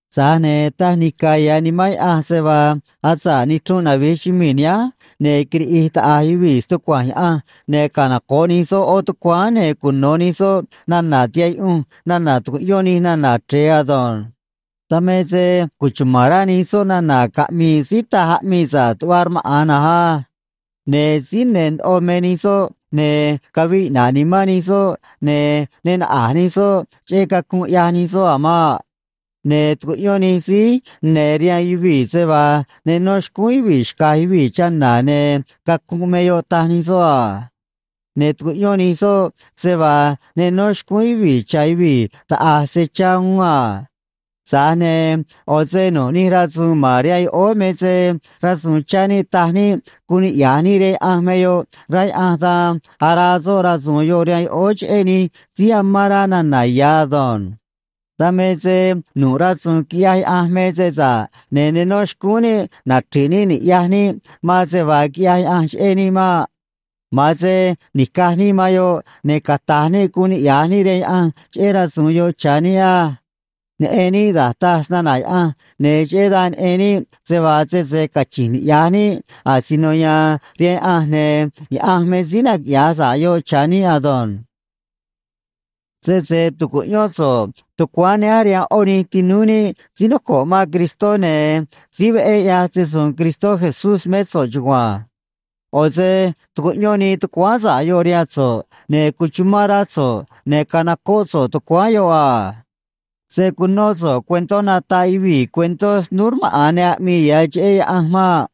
Tza̱j ne̱ taj nica̱ ya̱ Nimán Yaꞌanj se vaa asa̱ꞌ nichrunꞌ navi̱j chumii̱ nihánj, ne̱ quiriꞌi̱j taꞌa̱j yuvii̱ stucua̱nj Yaꞌanj, ne̱ canoco̱ꞌ nij soꞌ ꞌó tucuáán, ne̱ cuno̱ nij soꞌ nana̱ tihaꞌ yuꞌunj nana̱ tu̱cuꞌyón nij nana̱ chre̱e ado̱nj. Dan me se cuchuma̱n rá nij soꞌ nana̱ caꞌmi̱i̱ síí taj aꞌmii sa̱ꞌ tuꞌva rmaꞌa̱n na̱nj á. Ne̱ síí ne̱ ndoꞌo me nij soꞌ, ne̱ caviꞌ iꞌna̱ꞌ nimán nij soꞌ ne̱ ne naꞌa̱j nij soꞌ cheꞌé cacunꞌ ꞌyaj nij soꞌ a̱ maꞌ. Ne̱ tucuꞌyón nij síí ne̱ rihaan yuvii̱ se vaa ne no xcúún yuvii̱ xca̱j yuvii̱ chana̱, ne̱ cacunꞌ me yoꞌ, taj nij soꞌ a. Ne̱ tucuꞌyón nij soꞌ se vaa ne no xcúún yuvii̱ cha̱ yuvii̱ taꞌa̱j se chá uún a. Tza̱j ne̱ ꞌo̱ se nu̱ꞌ nij rasu̱u̱n ma̱n rihaan yoꞌóó me se rasu̱u̱n chá níꞌ taj níꞌ guun niꞌya̱j níꞌ rihaan Yaꞌanj me yoꞌ, rá Yaꞌanj, dan araa soꞌ rasu̱u̱n yoꞌ rihaan yoꞌóó cheꞌé nij síí amán rá nana̱ ya̱ ado̱nj. Dan me se nu̱ꞌ rasu̱u̱n quiꞌyaj Yaꞌanj me se sa̱ꞌ, ne̱ ne nó xcúún níꞌ nachri̱ꞌ níꞌ ni̱ꞌyaj níꞌ man se vaa quiꞌyaj Yaꞌanj cheꞌé níꞌ maꞌ. Ma̱an se ni̱caj níꞌ man yoꞌ, ne̱ cata̱j níꞌ guun niꞌya̱j níꞌ rihaan Yaꞌanj cheꞌé rasu̱u̱n yoꞌ cha̱ níꞌ á. Neꞌen níꞌ da̱j taj snana̱ Yaꞌanj, ne̱ cheꞌé dan neꞌen níꞌ se vaa sese cachi̱nj niꞌya̱j níꞌ asino ya̱a̱n rihaan Yaꞌanj, ne̱ Yaꞌanj me síí naquiꞌya̱j sa̱ꞌ yoꞌ cha̱ níꞌ ado̱nj. Sese tu̱cuꞌyón so̱ꞌ tucuáán nihánj rihaan ꞌó nij tinúú níꞌ síí noco̱ꞌ man Cristó, ne̱ síí veꞌé ꞌyaj se‑su̱u̱n Cristó Jesús mé so̱ꞌ chugua̱nj. ꞌO̱ se tucuꞌyón nii tucuáán sa̱ꞌ yoꞌ rihaan so̱ꞌ, ne̱ cuchumán rá so̱ꞌ, ne̱ canocóꞌ so̱ꞌ tucuáán yoꞌ a. Se̱ cunó so̱ꞌ cuentó nataꞌ yuvii̱ cuentó snúú rmaꞌa̱n ne aꞌmii ya̱ cheꞌé Yaꞌanj maꞌ.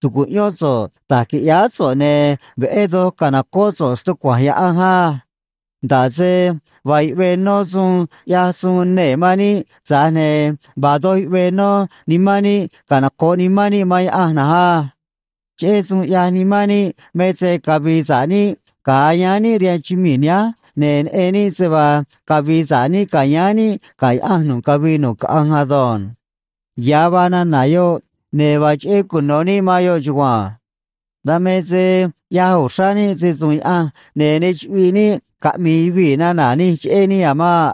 Tu̱cuꞌyón so̱ꞌ da̱j qui̱ꞌyáá so̱ꞌ, ne̱ veꞌé doj ca̱nocóꞌ so̱ꞌ stucua̱nj Yaꞌanj á. Nda̱ꞌ se vaa yuꞌvee nó suun ꞌyaj suun nee̱ man níꞌ, tza̱j ne̱ vaa doj yuꞌvee nó nimán níꞌ, canoco̱ꞌ nimán níꞌ man Yaꞌanj na̱nj á. Cheꞌé suun ꞌyaj nimán níꞌ me se cavi̱i̱ sa̱ꞌ níꞌ ga̱a yáán níꞌ rihaan chumii̱ nihánj, ne̱ neꞌen níꞌ se vaa cavi̱i̱ sa̱ꞌ níꞌ ca̱yáán níꞌ ga̱ Yaꞌanj nu̱ꞌ cavii nu̱ꞌ caꞌanj ado̱nj. Ya̱ vaa nana̱ yoꞌ, ne̱ vaa cheꞌé cuno̱ níꞌ man yoꞌ chugua̱nj. Dan me se ꞌyaj uxrá níꞌ se‑su̱u̱n Yaꞌanj, ne̱ ne chuꞌviꞌ níꞌ caꞌmi̱i̱ yuvii̱ nana̱ nij cheꞌé níꞌ a̱ maꞌ.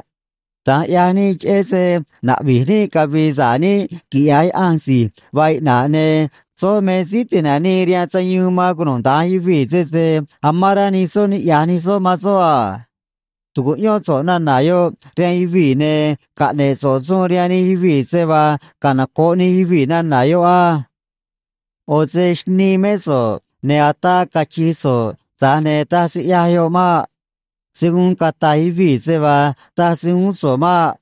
Da̱nj ꞌyaj níꞌ cheꞌé se naꞌvi̱j níꞌ cavi̱i̱ sa̱ꞌ níꞌ quiꞌya̱j Yaꞌanj si̱j vaa iꞌna̱ꞌ, ne̱ soꞌ me Síí Ti̱nanii rihaan Sayuun man cunuda̱nj yuvii̱ sese amán rá nij soꞌ niꞌya̱j nij soꞌ man soꞌ a. Tu̱cuꞌyón so̱ꞌ nana̱ yoꞌ rihaan yuvii̱, ne̱ caꞌne̱ꞌ so̱ꞌ suun rihaan nij yuvii̱ se vaa canoco̱ꞌ nij yuvii̱ nana̱ yoꞌ á. ꞌO̱ se xnii mé so̱ꞌ, ne̱ ataa cachi̱j so̱ꞌ, tza̱j ne̱ taj se ꞌyaj yoꞌ maꞌ. Se̱ guun cata̱j yuvii̱ se vaa taj se uún so̱ꞌ maꞌ.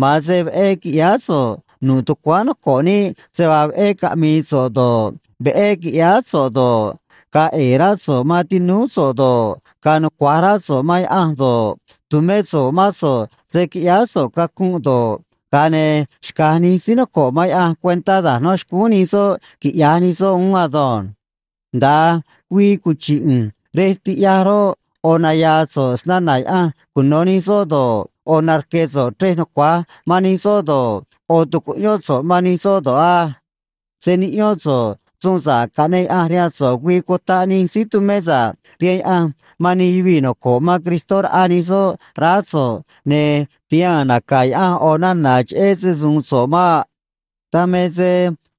Ma̱an se veꞌé qui̱ꞌyáá so̱ꞌ nu̱ꞌ tucuáán noco̱ꞌ níꞌ, se vaa veꞌé caꞌmi̱i̱ so̱ꞌ do̱ꞌ, veꞌé qui̱ꞌyáá so̱ꞌ do̱ꞌ, ga̱a̱ ꞌe̱e̱ rá so̱ꞌ man tinúú so̱ꞌ do̱ꞌ, ga̱a̱ nucua̱j rá so̱ꞌ man Yaꞌanj do̱ꞌ, tu̱mé so̱ꞌ mán so̱ꞌ se̱ quiꞌyáá so̱ꞌ cacunꞌ do̱ꞌ, ga̱a ne̱ xca̱j nij síí noco̱ꞌ man Yaꞌanj cuentá da̱j no̱ xcúún nij soꞌ quiꞌya̱j nij soꞌ uún ado̱nj. Nda̱a güii cuchi̱ꞌ ꞌu̱nj rej tiꞌyaj roꞌ, ꞌo̱ naya̱a̱ so̱ꞌ snana̱ Yaꞌanj cuno̱ nij soꞌ do̱ꞌ, ꞌo̱ narque̱ so̱ꞌ chrej nucua̱j man nij soꞌ do̱ꞌ, ꞌo̱ tu̱cuꞌyón so̱ꞌ man nij soꞌ do̱ꞌ á. Se̱ niꞌyón so̱ꞌ suun sa̱ꞌ caꞌneꞌ Yaꞌanj rihaan so̱ꞌ güii cutaꞌ nij síí tumé sa̱ꞌ rihaan Yaꞌanj man nij yuvii̱ noco̱ꞌ man Cristó raꞌa nij soꞌ raá so̱ꞌ, ne̱ tihaa̱n naca̱ Yaꞌanj ꞌo̱ nana̱ cheꞌé se‑su̱u̱n so̱ꞌ maꞌ. Dan me se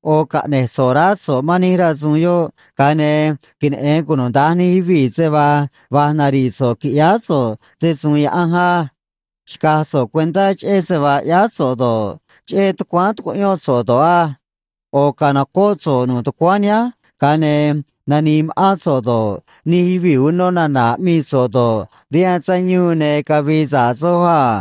ꞌo̱ caꞌne̱j so̱ꞌ raá so̱ꞌ man nij rasu̱u̱n yoꞌ, ga̱a ne̱ queneꞌe̱n cunuda̱nj nij yuvii̱ se vaa va̱j nari̱ꞌ so̱ꞌ qui̱ꞌyáá so̱ꞌ se‑su̱u̱n Yaꞌanj á. Xca̱j so̱ꞌ cuentá cheꞌé se vaa ꞌyáá so̱ꞌ do̱ꞌ, cheꞌé tucuáán tucuꞌyón so̱ꞌ do̱ꞌ á. ꞌO̱ ca̱nocóꞌ so̱ꞌ nu̱ꞌ tucuáán nihánj, ga̱a ne̱ nani̱i̱ ma̱ꞌán so̱ꞌ do̱ꞌ, nij yuvii̱ uno nana̱ aꞌmii so̱ꞌ do̱ꞌ, rihaan sayuun ne̱ cavi̱i̱ sa̱ꞌ soj a.